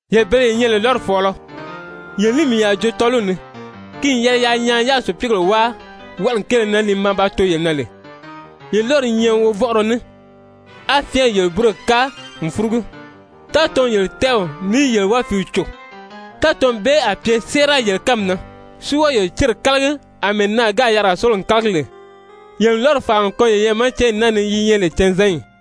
Yele bele ye nyɛ lè lɔ́ri fɔ̀ɔlɔ, yele ní mii a joo tɔ́ɔliw ni! Ki n yɛlɛ yaa nyaan yáā sùpiigèle wáa wɔʔɔli kéele na li maa ba too yele na lè! Yele lɔ́ri i nyɛ wovɔnʔɔrɔ ní, á fyɛɛnrɛ yele búroyi káa n fúrugu. Tátɔɔnw n yele tɛ́ɛw ní yele wálifiiw cò. Tátɔɔnw bee a pye séera yele kánmi na, si wɔ́ɔ yele céri kálagi àmɛɛ naà gáà yarigaa sórigo n kálagi lè. Yele n lɔ́ri fàari n kɔn yeyɛɛ ma cányi naa ni yi nyɛ lè canzanyi!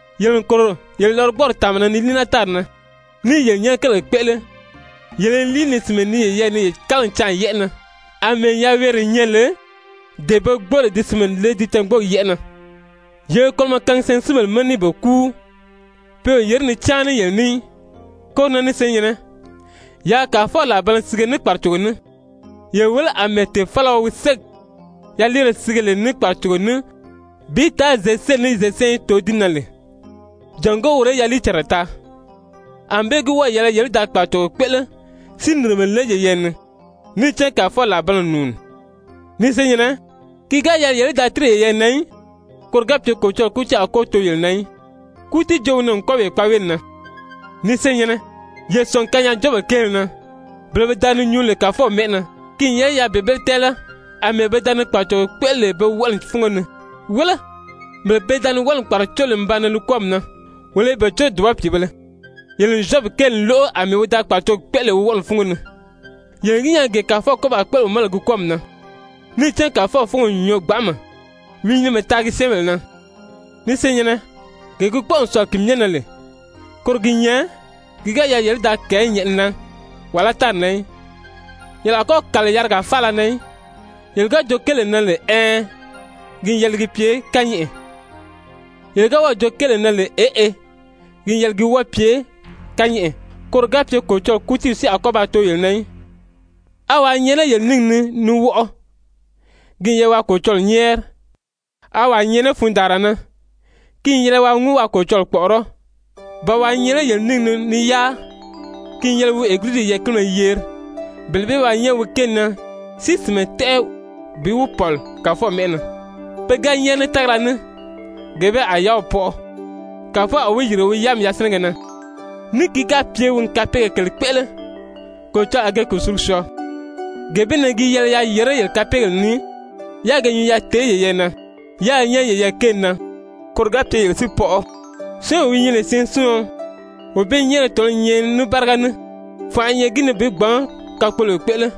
Yele n kòro yele lɔgbɔɔri tàanma na ni líi naa tári na, ní i yele nyɛ́nɛ kérigèle kpéʔele, yele i líi ni sìnmɛ nii yeyɛɛ ni yele kálagili canʔa yɛ́ʔɛ na, àmɛɛ yaweere nyɛ lè dee pe gbóo lè di sìnmɛ le ti cângboogi yɛ́ʔɛ na. Yele i kolomɔ kaangi syɛɛnsinbèle ma ní i be kúu, pe o yèré ni cáan ní yele ní í. Koro na ni senyɛ̀nnɛ, yaa Kàfɔw làribanna sige ní kpàracogo ní. Ye wéle àmɛɛ tèfalaɔ wi ségi yaliire sige lè ní kpàracogo ní bi taa zěseliyi ní zěsanyi í too di na lè, jàngó woro í yaliicànra taa. Anbée gi wɔ́ɔ̀ yɛlɛ yele í da kpàracogo kpéʔele si nìrimɛ le yeyɛɛ ni, níì cán Kàfɔw làribanna n nùuni. Ni senyɛ̀nnɛ, ki ga yɛlɛ yele í da tíri yeyɛɛ na í, koro ga pye Kolocɔlɔɔ kútiiw a kɔ́ too yele na í. Kútiijoow wi nan n kwɔ́ɔ wee kpaaweeli na. Ni senyɛ̀nnɛ, ye sɔ̀ngi kanyaajoobèle kéele na, bele pe da ni nyuu lè Kàfɔw mɛ́ʔɛ na, ki n yɛlɛ yaa bele bee tɛ́ɛlɛ àmɛɛ pe da ni kpàracogo kpéʔele lè pe wɔʔɔli fúngo ni. Wéle, bele pe da ni wɔʔɔli kpàracó lè n baa nan li kwɔ́ɔmi na, wolo i be córo dùba pìibēle. Yele n Zyɔbi kéeli lóʔo àmɛɛ wi da kpàracogi kpéʔele lè wi wɔʔɔli fúngo ni. Yele n gi nyaa gee Kàfɔw kɔ́ baa kpéʔele wi ma lè ki kwɔ́ɔmi na, níì cán Kàfɔw fúngo n nyɔɔ gbanʔama, wi i nyinimɛ taagi syɛ́ɛnbèle na. Ni senyɛ̀nnɛ, gee gi kpɔ́ʔɔ n sɔ̀lɔ ki myɛ na lè, koro gi nyɛ, ki ga yɛlɛ yele í da kɛ̀ɛ́ nyɛ̀ʔɛni na wàlá tári na í, yele a kɔ́ kàli yarigaa faala na í. Yele ga joo kéelee na lè «ɛɛn,» ki n yɛlɛ ki pye kányɛʔɛ, yele ga wɔ́ɔ̀ joo kéelee na lè «eʔe,» ki n yɛlɛ ki wɔ́ɔ pye kányɛʔɛ, koro ga pye Kolocɔlɔɔ kútiiw si a kɔ́ ba too yele na í. A wàa i nyɛ lé yele níngi ni ni wɔʔɔ? Ki n yɛlɛ waa Kolocɔlɔɔ nyɛ́ɛri. A wàa i nyɛ lé fundaanra na? Ki n yɛlɛ waa ŋúu waa Kolocɔlɔɔ kpɔ̀ʔɔrɔ́. Ba wàa i nyɛ lé yele níngi ni ni yáa? Ki n yɛlɛ wi Egiliziw yɛɛ̀kinibéle yeri, bele bee í ba nyɛ́ɛri wi kéeli na si sìnmɛ tɛ́ʔɛ bi wi pɔ̀li Kàfɔw mɛ́ʔɛ na. Pe ga nyɛ́ɛri ní tágala ní, gee bee a yáaw pɔʔɔ, Kàfɔw a wi yìrige wi yáami yasinɛgɛ na. Ní ki ga pye wi n kapeegèle kèle kpéʔele, Kolocɔlɔɔ a ge kùsulugi syɔɔ. Gee bee na gi yɛlɛ yaa yèré yele kapeegèle ni, yáā ge nyuu yaa tèé yeyɛɛ na, yáā nyɛ́ɛri yeyɛɛ kéeli na, koro ga pye yele si pɔʔɔ. Syɔ́ɔnwee wi nyɛ lè syɛɛnsiɔn, wee bee nyɛ́ɛrigɛ tɔ̀nɔ́ i nyɛ ní báriga ní, fànʔa i nyɛ gi ni bi gbǎn kakpoloyo kpéʔele.